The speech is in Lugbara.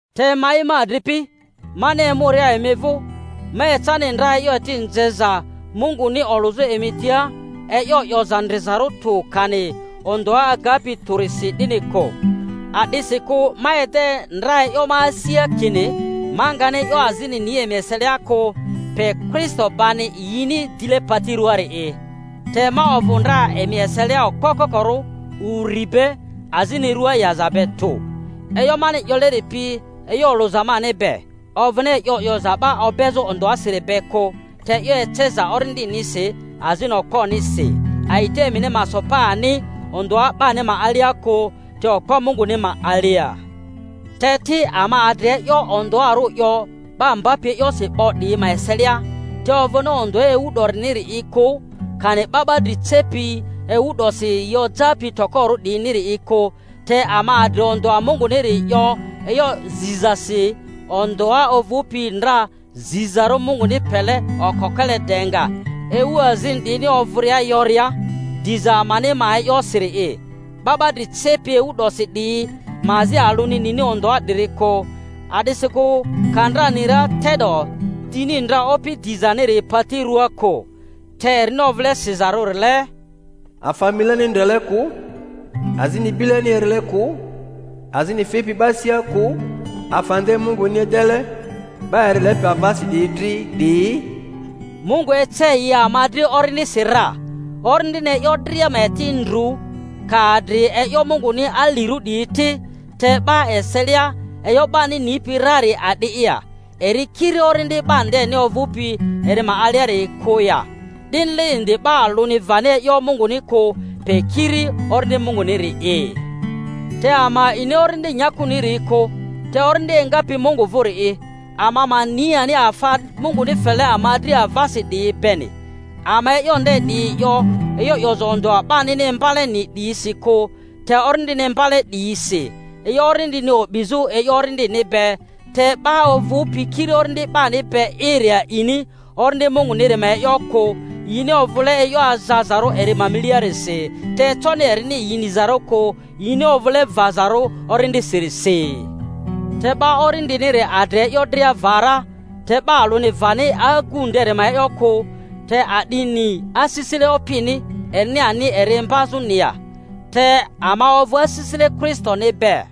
Te ma'i, ma adripi, mani emuria emi vᴜ, ma ecani ndra e'yo eti nzeza Munguni olᴜzᴜ emi tia e'yo 'yoza ndrizarᴜ tᴜ kani ondᴜa agapi tᴜrisi, 'dini kᴜ. A'disikᴜ ma ede ndra e'yo ma asia kini ma ngani e'yo azini ni emi eselia kᴜ pe Kristo bani yini dile pati rᴜaari'i. Te ma ovᴜ ndra emi eselia okpo kokorᴜ, uri be, azmi rᴜa yaza be tᴜ. E'yo mani 'yoleri pi e'yo olᴜza mani be, ovᴜni e'yo 'yoza 'ba obezᴜ ondᴜasiri be kᴜ, te e'yo eceza Orindinisi azini okponisi, a'ita emini ma so pa ani ondᴜa 'bani ma alia kᴜ te okpo Munguni ma alia. Te ti, ama adri e'yo ondᴜarᴜ 'yo ba mbapi e'yosi 'bo 'diyi ma eselia, te ovᴜni ondᴜa ewu 'doriniri'i kᴜ, kani 'ba 'ba dri cepi ewu 'dosi yi ojapi tokorᴜ 'diyiniri'i kᴜ, te ama adri ondᴜa Munguniri 'yo e'yo zizasi, ondᴜa ovᴜpi ndra zizarᴜ Munguni pele okokele de nga ewu azini 'diyini ovᴜria yoria diza amani ma e'yosiri'i. 'Ba 'ba dri cepi ewu 'dosi 'diyi ma azi alᴜni nini ondᴜa 'diri kᴜ; a'disikᴜ ka ndra ni ra te'do dini ndra Opi dizaniri pati rᴜaa kᴜ. Te erini ovᴜle sizarᴜrile, Afa mileni ndrele kᴜ, azini bileni erile kᴜ, azini fipi 'ba asia kᴜ, afa nde Munguni edele 'ba eri lepi avasi 'diyi dri 'diyi, Mungu ece yi ama dri Orindisi ra. Orindini e'yo dria ma eti ndru, ka adri e'yo Munguni alirᴜ 'diyi ti. Te 'ba eselia, e'yo 'bani nipi rari a'di'i ya; eri kiri orindi 'ba ndeni ovᴜpi eri ma aliari'i kᴜ ya? 'Dinile indi 'ba alᴜni vani e'yo Munguni kᴜ, pe kiri Orindi Munguniri'i. Te ama a'ini orindi nyakuniri kᴜ, te Orindi engapi Mungu vᴜri'i, ama ma ni ani afa Munguni fele ama dri avasi 'diyi beni. Ama e'yo nde 'diyi 'yo e'yo 'yoza ondᴜa 'banini imbaleni 'diyisi kᴜ, te Orindini imbaleni 'diyisi, e'yo orindini o'bizᴜ e'yo orindini be. Te 'ba ovᴜpi kiri orindi 'bani be'iri a'ini Orindi Munguniri ma e'yo kᴜ, yini ovᴜle e'yo azazarᴜ eri ma miliarisi; te econi erini yi nizarᴜ kᴜ, yini ovᴜle vazarᴜ orindisirisi. Te 'ba orindiniri adri e'yo dria va ra, te 'ba alᴜni vani agu nderi ma e'yo kᴜ. Te a'di ni asisile Opini, erini ani eri imbazᴜni ya? Te ama ovᴜ asisile Kristoni be.